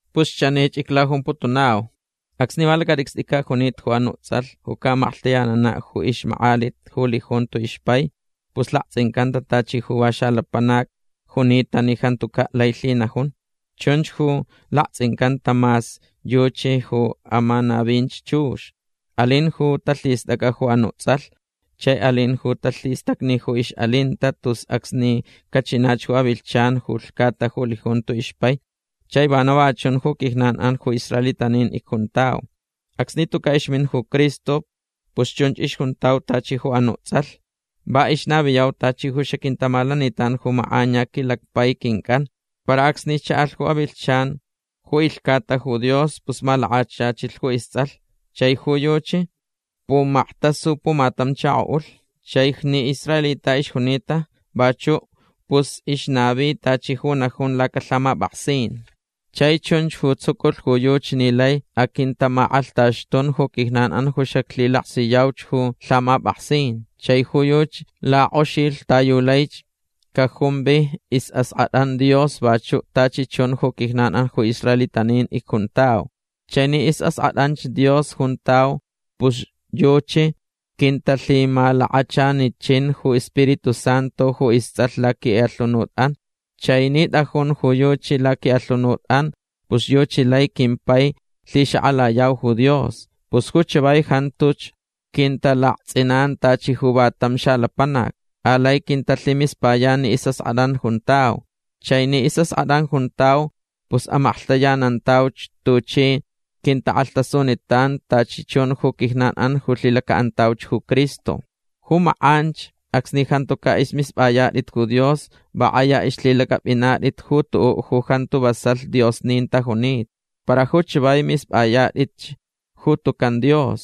Pus chanich iclajumputunau. Acsni va lacatʼicstʼicaʼ junita ju anuʼ tsʼalh ju caʼamaklhtayananaʼ ju ixmakʼalit ju lijunto ixpai pus laktsʼincantacaʼ tachi ju va xalapanac junita ni jantucaʼ lai lhinajun. Chunch ju laktsʼincantacaʼ mas yuchi ju amanavinch chux. Alin ju talhistʼacʼa ju anuʼ tsʼalh. Chai alin ju talhistacni ju ixʼalinta tus acsni cachinach ju avilhchan ju lhcata ju lijunto ixpai. Chai vana va chun ju quijnan ju israelitanin icjuntau. Acsni tucaʼ ixmin ju Cristo pus chunch ixjuntau tachi ju anuʼ tsʼalh. Va ixnaviyau tachi ju xaquintamalanitan ju makʼaniya quilacpai quincʼan. Para acsni chaʼalh ju avilhchan ju ilhcata ju Dios pus malakachachilh ju istsʼalh. Chai ju yuchi pumaktasu pumatam chakoʼulh. Chai ni israelita ixjunita vachuʼ pus ixnavi tachi ju najun lacalhamapʼaksin. Chai chunch ju tsuculh ju yuchi ni lai aquintamakʼalhtaxtun ju quijnan ju xaclhilaksiyauch ju lhamapʼaksin. Chai ju yuchi lakʼoxilh ta yu laich cajumvi isʼaskʼatʼan Dios vachuʼ tachi chun ju quijnan ju israelitanin icjuntau. Chai ni isʼaskʼatʼanch Dios juntau pus yuchi quintalhimalakachanichinch ju iSpiritu Santu ju istsʼalh laquiʼalhunutʼan. Chai ni tʼajun ju yuchi laquiʼalhunutʼan pus yuchi lai quimpai lhixakʼalayau ju Dios. Pus ju chavai jantuch quintalaktsʼinan tachi ju va tam xalapanac. Alai quintalhimispayan ni isʼaskʼatʼan juntau. Chai ni isʼaskʼatʼan juntau pus amaklhtayanantauch tuchi quintakʼalhtasunitan tachi chun ju quijnanʼan ju lhilacaʼantauch ju Cristo. Ju makʼanch acsni jantucaʼ ismispʼayatʼit ju Dios va kʼaya ixlhilacʼapʼinatʼit ju tuʼuʼ ju jantu vasalh diosnin tajunita. Para ju chavai mispʼayatʼitch ju tucan Dios.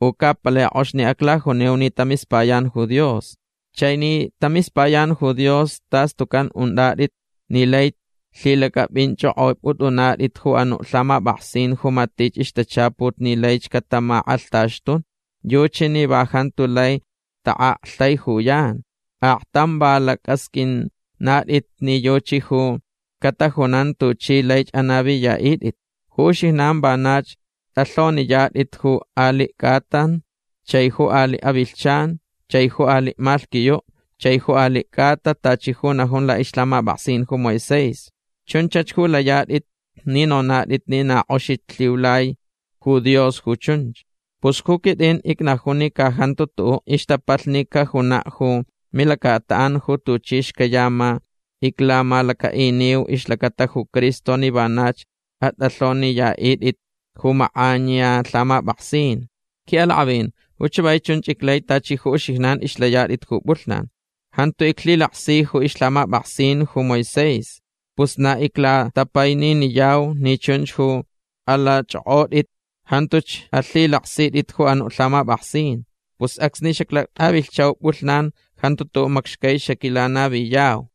U ca palai kʼox ni aclajunau ni tamispayan ju Dios. Chai ni tamispayan ju Dios tas tucan untʼatʼit ni laich lhilacʼapʼinchʼokʼopʼutʼunatʼit ju anuʼ lhamapʼaksin ju matich ixtachaput ni laich catamakʼalhtaxtun. Yuchi ju va jantu lai taʼaktaijuyan. Aktam va lacʼasqʼuinatʼit ni yuchi ju catajunan tuchi laich anaviyaʼitʼit. Ju uxijnan vanach tʼalhoniyatʼit ju aliʼ cʼatan chai ju aliʼ avilhchan chai ju aliʼ malhquiyuʼ chai ju aliʼ cʼata tachi ju najun laʼixlhamapʼaksin ju Moisés. Chunchach ju layatʼit ni nonatʼit ni na kʼoxich lhiulai ju Dios ju chunch. Pus ju quitʼin icnajun ni ca jantu tuʼuʼ ixtapalhni cajunaʼ ju milacataʼan ju tuchi xcayama iclamalacaʼiniu ixlacata ju Cristo ni vanach atʼalhoniyaʼitʼit ju makʼaniya lhamapʼaksin. Quiʼalakʼavin ju chavai chunch iclai tachi ju uxijnan ixlayatʼit ju pʼulhnan. Jantu iclhilaksi ju ixlhamapʼaksin ju Moisés. Pus na iclatapaininiyau ni chunch ju alachʼokʼotʼit. Jantuch alhilaksitʼit ju anuʼ lhamapʼaksin. Pus acsni xaclatʼavilhchau pʼulhnan jantu tuʼuʼ macxcai xaquilanaviyau.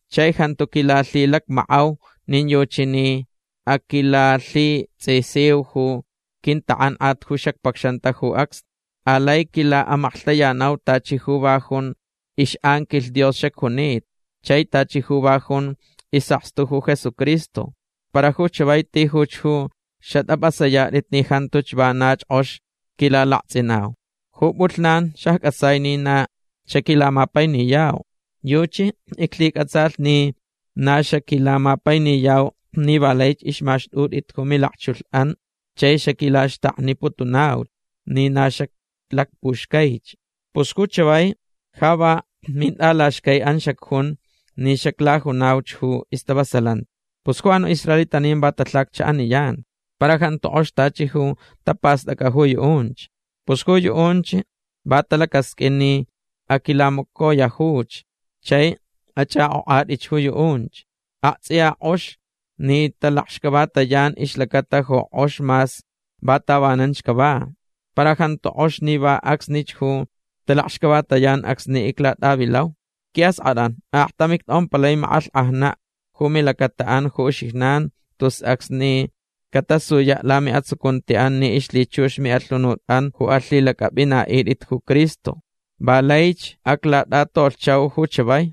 Chai jantu quilalhilacmackʼau nin yuchi ni aquilalhitsʼisiu ju quintakʼankʼat ju xacpacxanta ju acsnich. Alai quilaʼamaklhtayanau tachi ju va jun ixʼanquilh Dios xacjunita. Chai tachi ju va jun isʼakstu ju Jesucristo. Para ju chavai tijuch ju xatʼapʼasayatʼit ni jantuch vanach kʼox quilalaktsʼinau. Ju pʼulhnan xaccʼatsai ni na xaquilamapainiyau. Yuchi iclhicʼatsalh ni na xaquilamapainiyau ni va laich ixmaxtʼutʼit ju milakchulhʼan chai xaquilaxtakniputunauch ni na xaclacpuxcaich. Pus ju chavai ja va mintʼalaxcaiʼan xacjun ni xaclajunauch ju stavasalanti. Pus ju anuʼ israelitanin va talhacchaʼaniyan. Para jantu kʼox tachi ju tapastʼacʼa ju yuʼunch. Pus ju yuʼunch va talacasqʼuin ni aquilamacoyajuch. Chai achʼakʼokʼatʼit ju yuʼunch. Aktsʼiya kʼox ni talakxcavatayan ixlacata ju kʼox mas va tavananch cava. Para jantu kʼox ni va acsnich ju talakxcavatayan acsni iclatʼavilau. Quiʼaskʼatʼan aktam ictʼompalai makʼalhkʼajnaʼ ju milacataʼan ju uxijnan tus acsni catasuyaʼ lamiʼatsucuntiʼan ni ixlhichux miʼalhunutʼan ju alhilacʼapʼinaʼitʼit ju Cristo. Va laich aclatʼatolhchau ju chavai.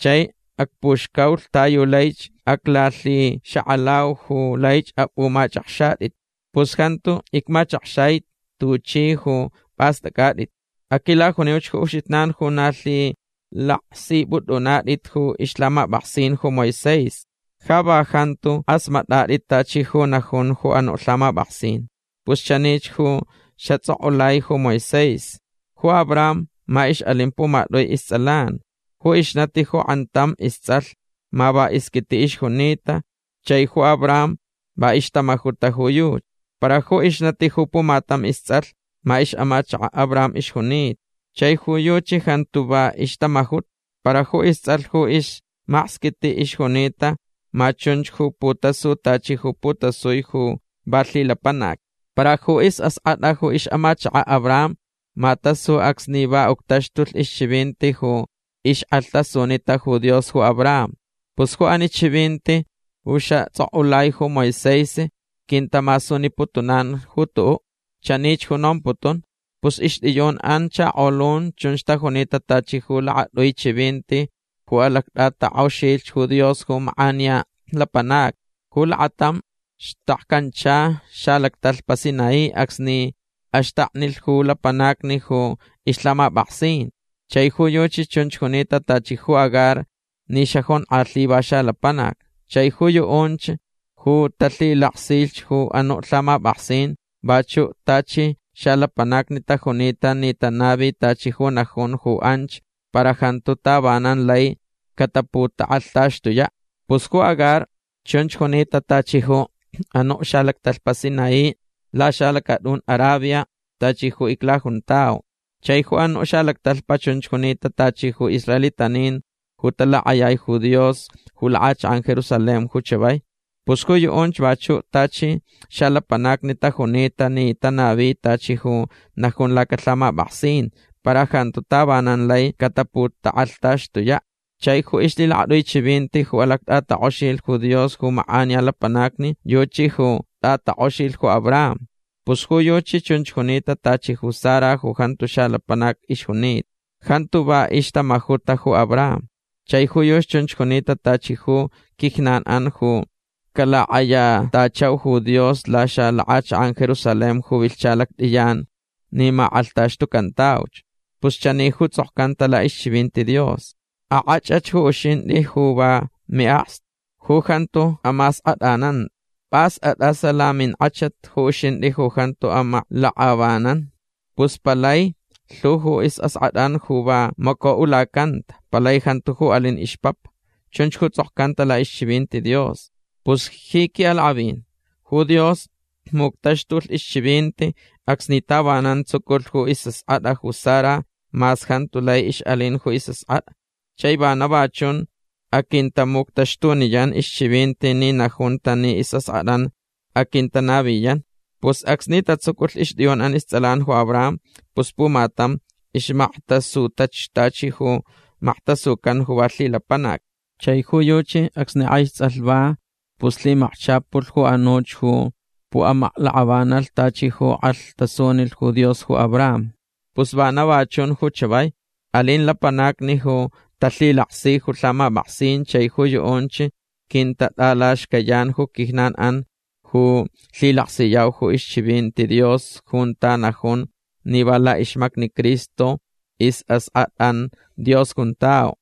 Chai acpuxcaulh ta yu laich aclalhixakʼalau ju laich apʼumachʼakxatʼit. Pus jantu icmachakxai tuchʼi ju pʼastʼacʼatʼit. Aquilajuniuch ju uxijnan ju na lhilaksipʼutʼunatʼit ju ixlhamapʼaksin ju Moisés. Ja va jantu kʼasmatʼatʼit tachi ju najun ju anuʼ lhamapʼaksin. Pus chanich ju xatsʼokʼulai ju Moisés. Ju Abraham ma ixʼalin pumatʼui istsʼalan. Ju ixnati ju kʼantam istsʼalh ma va isquitiʼ ixjunita chai ju Abraham va ixtamajuta ju yuchi. Para ju ixnati ju pumatam istsʼalh ma ixʼamachakaʼ Abraham ixjunita. Chai ju yuchi jantu va ixtamajuta. Pus ju istsʼalh ju ismaksquitiʼ ixjunita ma chunch ju putasu tachi ju putasucan ju va lhilapanac. Para ju isʼaskʼatʼa ju ixʼamachakaʼ Abraham ma tasu acsni va uctaxtulh ixchivinti ju ixkʼalhtasunita ju Dios ju Abraham. Pus ju ani chivinti ju xatsʼokʼulai ju Moisés quintamasuniputunan ju tuʼuʼ. Chanich ju nomputun. Pus ixtʼiyunʼan chakolun chunch tajunita tachi ju lakatʼui chivinti ju alactʼatakʼoxilh ju Dios ju makʼaniya lapanacni. Ju lakatam xtakcancha xalactalhpa Sinaí acsni axtaknilh ju lapanacni ju ixlhamapʼaksin. Chai ju yuchi chunch junita tachi ju Agar ni xajonkʼalhi va xalapanac. Chai ju yuʼunch ju talhilaksich ju anuʼ lhamapʼaksin vachuʼ tachi xalapanacni tajunita ni tanavi tachi ju najun ju anch para jantu tavanan lai cataputakʼalhtaxtuyaʼ. Pus ju Agar chunch junita tachi ju anuʼ xalactalhpa Sinaí laxalacatʼun Arabia tachi ju iclajuntau. Chai ju anuʼ xalactalhpa chunch junita tachi ju israelitanin ju talakʼayai ju Dios ju lakʼachakʼan Jerusalén ju chavai. Pus ju yuʼunch vachuʼ tachi xalapanacni tajunita ni tanavi tachi ju najun lacalhamapʼaksin para jantu tavanan lai cataputakʼalhtaxtuyaʼ. Chai ju ixlhilakatʼui chivinti ju alactʼatakʼoxilh ju Dios ju makʼaniya lapanacni yuchi ju tʼatakʼoxilh ju Abraham. Pus ju yuchi chunch junita tachi ju Sara ju jantu xalapanac ixjunita. Jantu va ixtamajuta ju Abraham. Chai ju yuchi chunch junita tachi ju quijnanʼan ju calakʼayatachau ju Dios laxalakʼachakʼan Jerusalén ju vilhcha lactʼiyan ni makʼalhtaxtucantauch. Pus chani ju tsʼokcanta laʼixchivinti Dios: Akʼachʼach ju uxintʼi ju va miʼakstu. Ju jantu amaskʼatʼanan. Pʼas atʼas laminkʼachat ju uxintʼi ju jantu amaklakʼavanan. Pus palai lhu ju isʼaskʼatʼan ju va macoʼulacanta. Palai jantu ju alin ixpapa. Chunch ju tsʼokcanta laʼixchivinti Dios. Pus ji quiʼalakʼavin ju Dios muctaxtulh ixchivinti acsni tavanan tsuculh ju isʼaskʼatʼa ju Sara mas jantu lai ixʼalin ju isʼaskʼatʼa. Chai vana va chun aquintamuctaxtuniyan ixchivinti ni najunta ni isʼaskʼatʼan aquintanaviyan. Pus acsni tatsuculh ixtʼiyunʼan istsʼalan ju Abraham pus pumatam ixmaktasutach tachi ju maktasucan ju va lhilapanac. Chai ju yuchi acsni kʼaich tsʼalh va pus lhimakchapulh ju anuch ju puʼamaklakʼavanalh tachi ju kʼalhtasunilh ju Dios ju Abraham. Pus vana va chun ju chavai. Alin lapanacni ju talhilaksi ju lhamapʼaksin chai ju yuʼunch quintatʼalaxcayan ju quijnanʼan ju lhilaksiyau ixchivinti Dios junta najun ni va laʼixmacni Cristo isʼaskʼatʼan Dios juntau.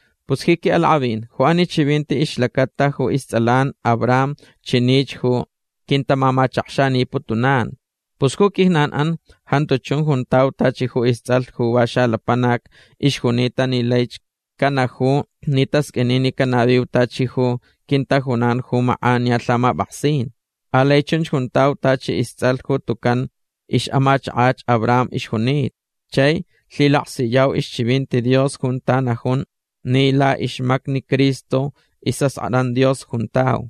Pus ji quiʼalakʼavin ju ani chivinti ixlacata ju istsʼalan Abraham chanich ju quintamamachakxaniputunan. Pus ju quijnanʼan jantu chun juntau tachi ju istsʼalh ju va xalapanac ixjunita ni laich canaju ni tasqʼuini ni canaviu tachi ju quintajunan ju makʼaniya lhamapʼaksin. Alai chunch juntau tachi istsʼalh ju tucan ixʼamachakach Abraham ixjunita. Chai lhilaksiyau ixchivinti Dios junta najun ni laʼixmacni Cristo isʼaskʼatʼan Dios juntau.